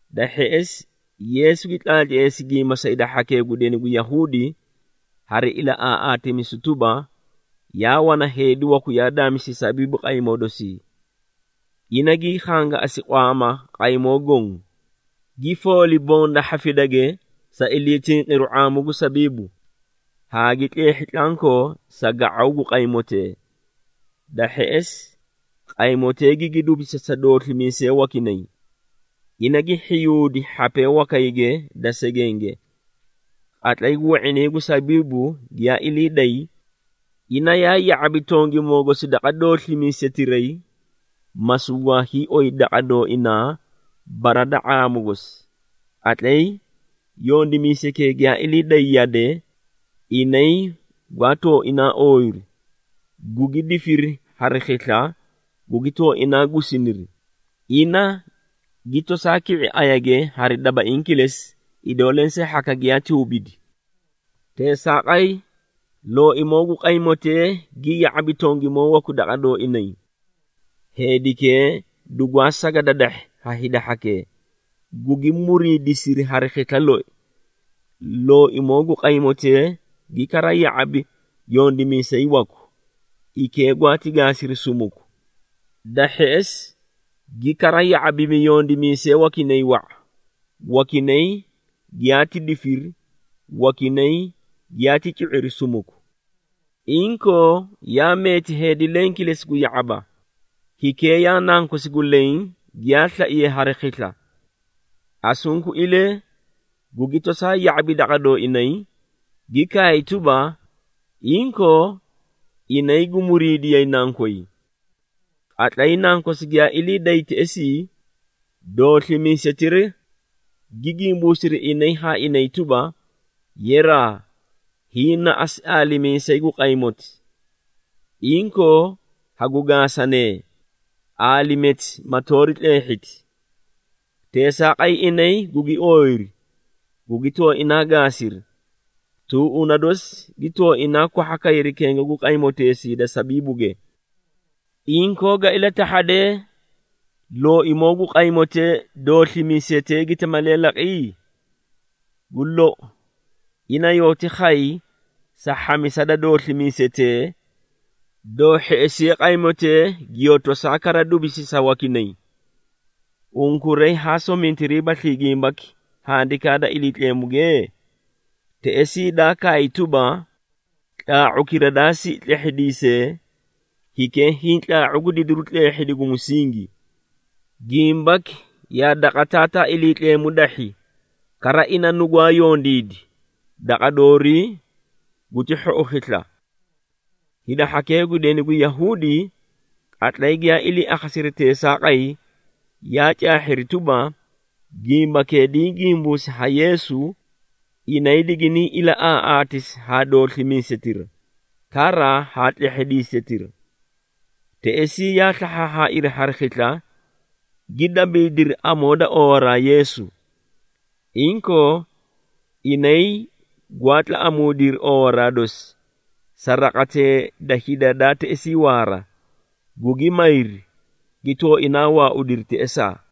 Da hheꞌesi Yeesu gi tlaatleesi gimba sa hida hhakee gu deni gu Yahuudi hari ilaꞌaaꞌaatimisu tuba, “Yaa wana heedi waku yaa daamisi sabiibu qaymoo dosii. Ina gii khangaꞌasi qwaama qaymoo goõ, gi fooli bonda hhafidage sa iliitinqiru ⁄aamu gu sabiibu, haa gi tleehhi tlankoo sa ga⁄aw gu qaymootee. Da hheꞌesi, qaymotee gigi dubisi sa dooslimiisee wakinay, ina gi hhiyuudi hhapee wakayge da segenge. Qatlay gu we⁄inay gu sabiibu giyaa ilii day, ina yaa ya⁄abi tongimoo gosi daqa dooslimiisetiray, ma sugwaa hiioyi daqa dooinaa bara da ⁄aamu gosi. Qatlay yondimiisaykee giyaa ilii day yade, inay gwaa tooinaa ooyiri, gugi difiri hari khisla, gugi tooinaa gusiniri, ina gi tosaa ki⁄i ayage hari dabaiĩ kilesi, idoo lensee hhaka giyaati hubidi. Teesaaqay, looimoo gu qaymotee gi ya⁄abi tongimoo waku daqa dooinay. Heedikee dugwaa saga dadahhi ha hida hhakee, gugi muriidisiri hari khisla loi. Looimoo gu qaymotee gi kara ya⁄abi yondimiisay waku, hikee gwaati gaasiri sumuku. Da hheꞌesi gi kara ya⁄abimi yondimiisee wakinay wa⁄a, wakinay giyaati difiri, wakinay giyaati cu⁄iri sumuku. Inkoo yaa meeti heedi leẽ kilesi gu ya⁄aba, hikee yaa nankosi gu leẽ giyaa slaiye hari khisla. Asunkuilee, gugi tosaa ya⁄abi daqa dooinay, gi kaay tuba, ‘Inkoo, inay gu muriidiyay nankoy.’ Qatlay nankosi giyaa ilii day teꞌesii, dooslimiisetira gi gimbuusiri inay haa inay tuba, ‘Yeraa, hiĩ na asu aalimiisayi gu qaymoti. Inkoo, hagu gaasanee, aalimeeti ma toori tleehhiti!’ Teesaaqay inay gugi ooyiri, gugi tooinaa gaasiri, tuuꞌuna dosi gi tooinaa kwahha kayri kenga gu qaymoteesii da sabiibuge. Inkoo ga ilatahhadee looimoo gu qaymotee, dooslimiisetee giti malee laqi? Gu lou, ina yooti khay sa hhamisa da dooslimiisetee, doo hheꞌesiye qaymotee giyoo tosaa kara dubisi sa wakinay. Unkuray haa somintiriibaslii gimbaki Handikaa da Iliitleemuge? Teꞌesii daa kaay tuba, ‘Tlaa⁄ukira daa siꞌi tlehhidiisee, hikee hiĩ tlaa⁄u gu didiru tleehhidi gu musingi. Gimbaki yaa daqa Taataa Iliitleemu dahhi, kara ina nugwaa yondiidi, daqa doorii guti hhou khisla.’” Hida hhakee gu deni gu Yahuudi qatlay giyaa ilii akhasiri teesaaqay, yaa caahhiri tuba, gimbakee diĩ gimbuusi ha Yeesu, inay diginiĩ ilaꞌaaꞌaatisi haa dooslimiisetira, kara haa tlehhidiisetira. Teꞌesii yaa slahhaahhaairi hari khisla, gi dabiidiri amoo da oowaraa Yeesu. Inkoo inay gwaa tlaꞌamuudiri oowaraa dosi sa raqatee da hida daa teꞌesii waara, gugi mayri, gi tooinaa waaudiri teꞌesaa.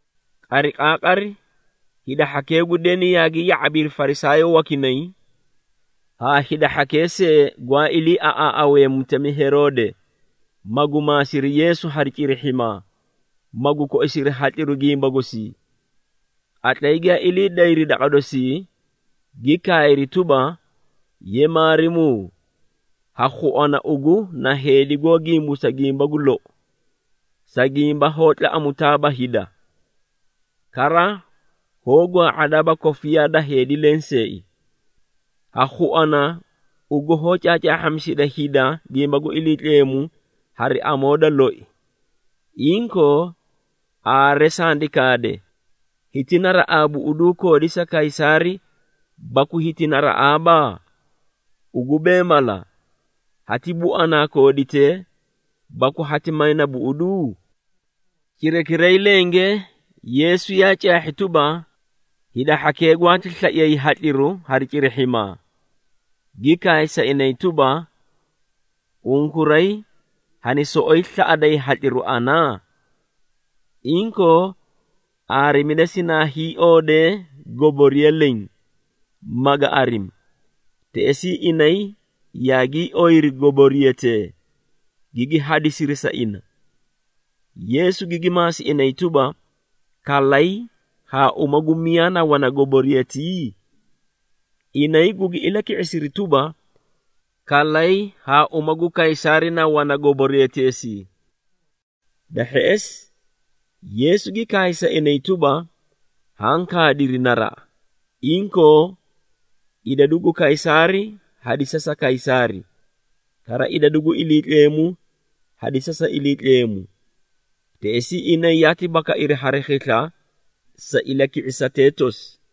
Qariqaaqari hida hhakee gu deni yaagi ya⁄abiri Farisaayoo wakinay haa hida hhakee see gwaa iliiaꞌaaꞌawee mutemi Heroode, magu maasiri Yeesu hari cirihhimaa, magu koisiri hatliru gimba gosii. Qatlay giyaa ilii dayri daqa dosii, gi kaayri tuba, “Ye Maarimuu, ha khuana, ugu na heedi goó gimbuusa gimba gu lou, sa gimba hoó tlaꞌamutaaba hida, kara hoó gwaa⁄adaaba kofiyaa da heedi lenseei. Ha khuana ugu hoó caacaahhamisida hida gimba gu Iliitleemu hari amoo da loi. Inkoo, aare sandi kaade, hiti naraꞌaa buꞌuduu koodi sa Kaysaari, baku hiti naraꞌaaba? Ugu bee mala, hati buanaa kooditee, baku hati mayna buꞌuduu?” Cirakiray lenge Yeesu yaa caahhi tuba, hida hhakee gwaati slaiyay hatliru hari cirihhimaa, gi kaay sa inay tuba, “Unkuray hani soꞌoyi slaꞌaday hatliru ana? Inkoo aarimida sinaa hiioodee goboriya leẽ, maga arimi.” Teꞌesii inay yaagii oyiri goboriyatee, gigi hadisiri sa ina. Yeesu gigi maasi inay tuba, “Kalay haa uma gu miyaa na wana goboriyatii?” Inay gugi ilaki⁄isiri tuba, “Kalay haa uma gu Kaysaari na wana goboriyateesii.” Da hheꞌesi Yeesu gi kaay sa inay tuba, “Haã kaadiri naraꞌa! Inkoo idadu gu Kaysaari hadisa sa Kaysaari, kara idadu gu Iliitleemu hadisa sa Iliitleemu.” Teꞌesii inay yaati bakairi hari khisla sa ilaki⁄isatee tosi.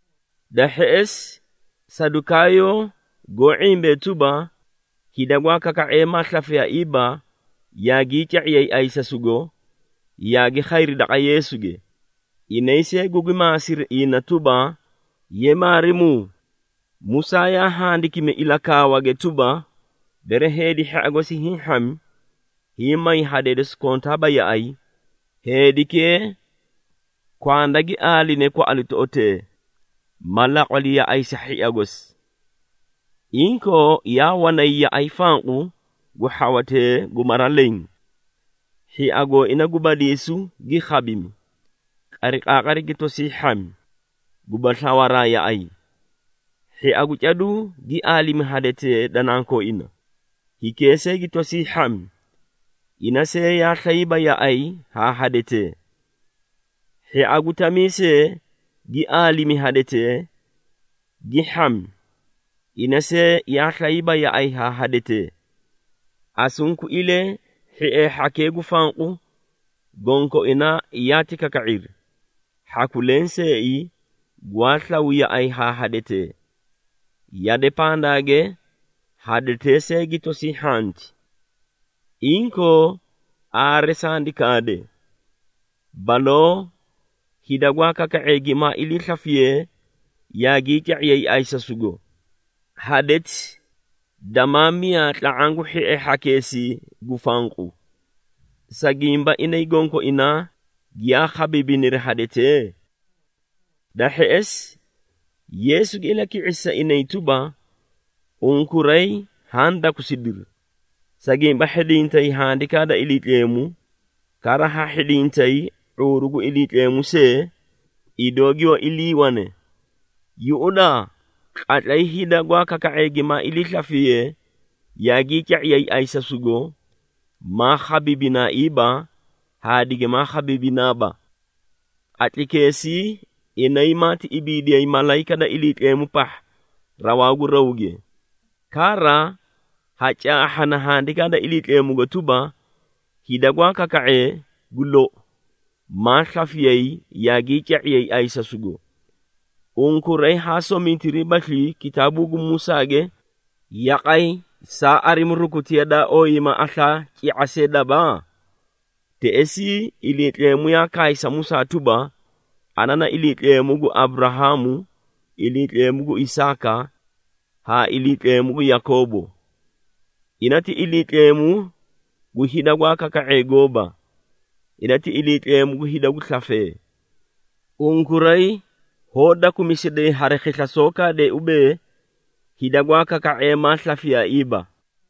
Da hheꞌesi Sadukaayoo, goó ⁄imbee tuba, hida gwaa kaka⁄ee maa slafiyaiiba yaagii ca⁄iyay ayisago, yaagi khayri daqa Yeesuge, inay see gugi maasiri ina tuba, “Ye Maarimuu, Musaa yaa handikimi ilakaawage tuba, bere heedi hhia gosi hiĩ hhami, hiĩ may hadee dosi kontaaba yaꞌay, heedikee kwanda gi aaline kwaꞌalitoꞌotee, ma laqwali yaꞌay sa hhia gosi. Inkoo yaa wanay yaꞌay fanqu gu hhawatee gu mara leẽ. Hhia gooina gu badiisu gi khabimi, qariqaaqari gi tosii hhami, guba slawaraa yaꞌay. Hhia gu caduu gi aalimi hadetee da nankooina, hikee see gi tosii hhami, ina see yaa slayiiba yaꞌay haa hadetee. Hhia gu tamiisee gi aalimi hadetee, gi hhami, ina see yaa slayiiba yaꞌay haa hadetee. Asunkuilee hhiee hhakee gu fanqu, gonkoinaa yaati kaka⁄iri, hhaku lenseei gwaa slaw yaꞌay haa hadetee. Yade pandaage hadetee see gi tosii hhanti. Inkoo aare sandi kaade, baloo hida gwaa kaka⁄ee gimaa iliislafisiye yaagii ca⁄iyay ayisasugo, hadeti damaa miyaa tla⁄aã gu hhiee hhakeesii gu fanqu. Sa gimba inay gonkoinaa giyaa khabiibiniri hadetee?” Da hheꞌesi Yeesu gi ilaki⁄isi sa inay tuba, “Unkuray haã dakusidiri, sa gimba hhidintay Handikaa da Iliitleemu, kara ha hhidintay ⁄uuru gu Iliitleemu see idoo giyoó iliiwane! Yuꞌudaa, qatlay hida gwaa kaka⁄ee gimaa iliislafiyee yaagii ca⁄iyay ayisasugo, maa khabiibinaaiiba haa digimaa khabiibinaaba. Qatlaykeesii inay maati ibiidiyay malayika da Iliitleemu pahha raw gu rawge. Kara ha caahhana Handikaa da Iliitleemugo tuba, hida gwaa kaka⁄ee, gu lou, maa slafiyay yaagii ca⁄iyay ayisasugo. Unkuray haa somintiriibaslii kitaabuu gu Musaage, yaqay saa arimi rukutiya daa ooyiiyima aslaa, ci⁄a see daba? Teꞌesii Iliitleemu yaa kaay sa Musaa tuba, ‘Ana na Iliitleemu gu Aburahaamu, Iliitleemu gu Isaaka, haa Iliitleemu gu Yakoobo.’ Ina ti Iliitleemu gu hida gwaa kaka⁄ee gooba. Ina, ti Iliitleemu gu hida gu slafee. Unkuray hoó dakumisiday hari khisla soó kaadee ubee, hida gwaa kaka⁄ee maa slafiyaaiiba!”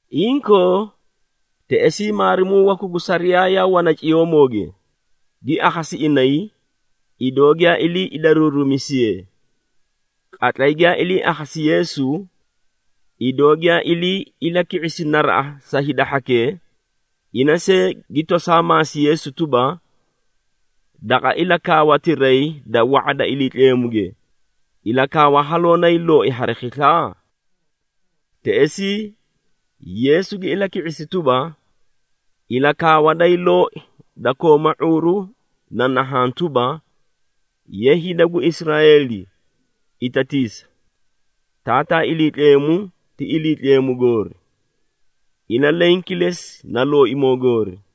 Inkoo teꞌesii maarimuu waku gu sariyaa yaa wana ciyoomooge, gi akhasi inay, idoo giyaa ilii idaruurumisiyee. Qatlay giyaa ilii akhasi Yeesu, idoo giyaa ilii ilaki⁄isi naraꞌa sa hida hhakee, ina see gi tosaa maasi Yeesu tuba, “Daqa ilakaawatiray da wa⁄a da Iliitleemuge, ilakaawa haloo nayii looi hari khisla?” Teꞌesii Yeesu gi ilaki⁄isi tuba, “Ilakaawa dayii looi, da kooma ⁄uuru na nahaã tuba, ‘Ye hida gu Israeeli, itatiisa, Taataa Iliitleemu ti Iliitleemu goori, ina leẽ kilesi na Looimoo goori.’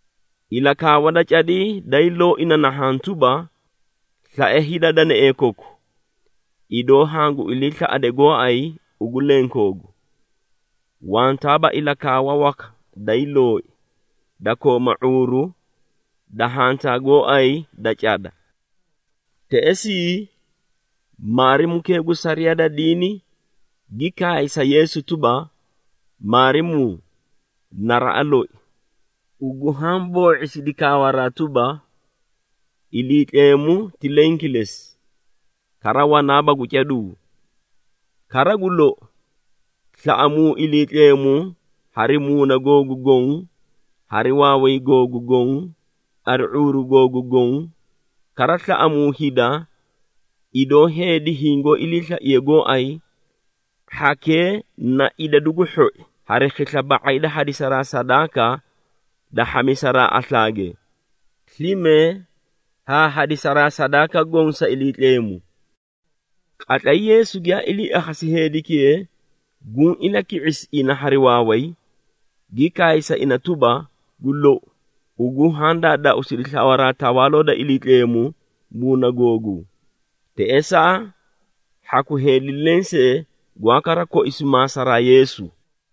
Ilakaawa da cadii dayii looi na nahaã tuba, ‘Slae hida danaee koku, idoo hangu iliislaꞌade gooay ugu lenkoogu.’ Wantaaba ilakaawa waka dayii looi, da kooma ⁄uuru da hantaa gooay da cada.” Teꞌesii maarimukee gu sariyaa da diini gi kaay sa Yeesu tuba, “Maarimuu, naraꞌa loi! Ugu haã boo⁄isidi kaawaraa tuba, Iliitleemu ti leẽ kilesi, kara wanaaba gu caduu. Kara gu lou, slae Taataa Iliitleemu hari ilahudaa koku goõ, hari slafimaa koku goõ, hari ⁄uuru googu goõ, kara slaꞌamuu hida, idoo heedi hingoó iliislaiye gooay, hhakee na idadu gu hhoi hari khisla ba⁄ay da hadisaraa sadaaka da hhamisaraa aslaage, slime haa hadisaraa sadaaka goõ sa Iliitleemu.” Qatlay Yeesu giyaa ilii akhasi heedikee guũ ilaki⁄isi ina hari waaway, gi kaay sa ina tuba, “Gu lou, ugu haã daadaauusidi slawaraa Tawaaloo da Iliitleemu muuna googuu.” Teꞌesaa hhaku heedi lensee gwaa kara koisu maasaraa Yeesu.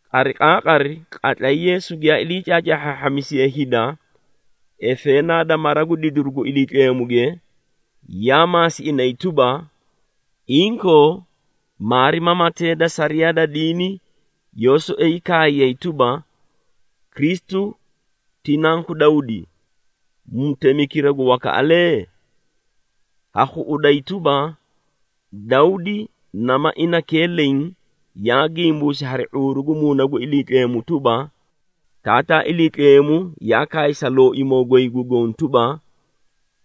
Qariqaaqari, qatlay Yeesu giyaa ilii caacaahhaahhamisiye hida efeenaa da mara gu didiru gu Iliitleemuge, yaa maasi inay tuba, “Inkoo maarimamatee da sariyaa da diini yoó soꞌoyi kaayay tuba, Kristu ti Nanku Dawdi, mutemikira gu wakaꞌalee? Ha khuꞌuday tuba, Dawdi nama inakee leẽ yaa gimbuusi hari ⁄uuru gu Muuna gu Iliitleemu tuba, Taataa Iliitleemu yaa kaay sa Looimoo goy gu Goõ tuba,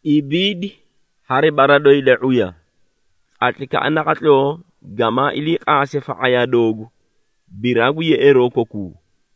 ‘Ibiidi hari bara doyi da ⁄uya, qatlaykaꞌa naqatloo gamaa ilii qaase fa⁄ayaa doogu, biraa gu yeꞌeeroo kokuu.’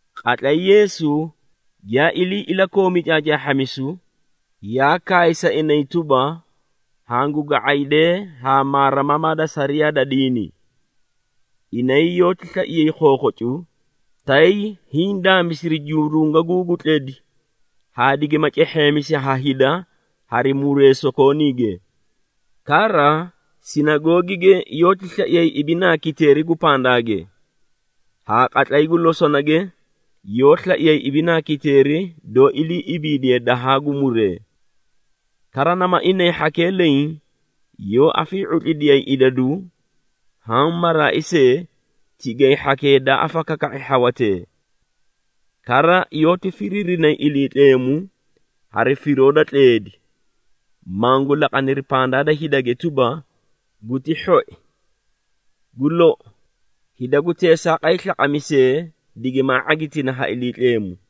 Qatlay Yeesu giyaa ilii ilakoomi caacaahhamisu, yaa kaay sa inay tuba, “Hangu ga⁄aydee haa maarimamaa da sariyaa da diini. Inay yoóti slaiyay khokhocu, tay hiĩ daamisiri jurungaguu gu tledi haa digima cehheemisi ha hida hari muree sokooniige. Kara sinagoogige yoóti slaiyay ibinaa kiteeri gu pandaage, haa qatlay gu losonage, yoó slaiyay ibinaa kiteeri doó ilii ibiidiye dahaa gu muree. Kara nama inay hhakee leẽ yoó afii⁄utlidiyayi idadu haã maraai see, tigay hhakee daa afakaka⁄i hhawatee. Kara yoóti firiirinay Iliitleemu hari firoo da tleedi, mangu laqaniri pandaa da hidage tuba, guti hhoi. Gu lou, hida gu teesaaqay slaqamisee digimaa ⁄agitina ha Iliitleemu.”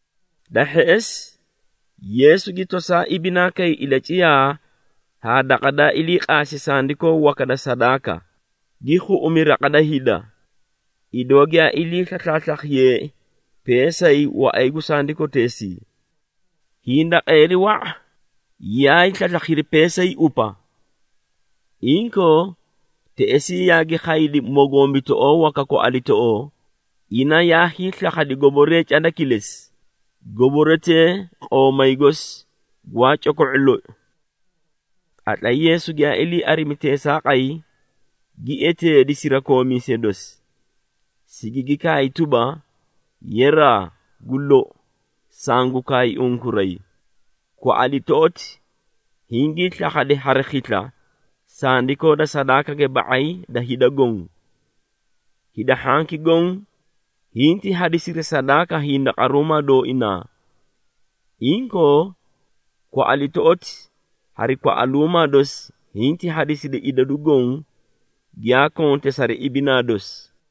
Da hheꞌesi Yeesu gi tosaa ibinaa kay ilaciyaa haa daqa daa ilii qaasi sandikoo waka da sadaaka, gi khuꞌumi raqa da hida, idoo giyaa ilii slaslaaslakhiyeei peesay waꞌay gu sandikoteesii. Hindaqeeri wa⁄a yaay slaslakhiri peesay upa. Inkoo teꞌesii yaagi khaydi mogombitoꞌoo waka kwaꞌalitoꞌoo, ina yaa hiislakhadi goboree cada kilesi, goboretee qoomay gosi gwaa coko⁄u loi. Qatlay Yeesu giyaa ilii arimi teesaaqay, gi eteedi sirakoomiisee dosi, sigigi kaay tuba, “Yeraa, gu lou, sangu kaay unkuray, kwaꞌalitoꞌoti hingii slakhadi hari khisla sandikoo da sadaakage ba⁄ay da hida goõ. Hida hhanki goõ hinti hadisiri sadaaka hindaqaruumaa dooinaa. Inkoo kwaꞌalitoꞌoti hari kwaꞌaluumaa dosi hinti hadisidi idadu goõ, giyaa konte sari ibinaa dosi.”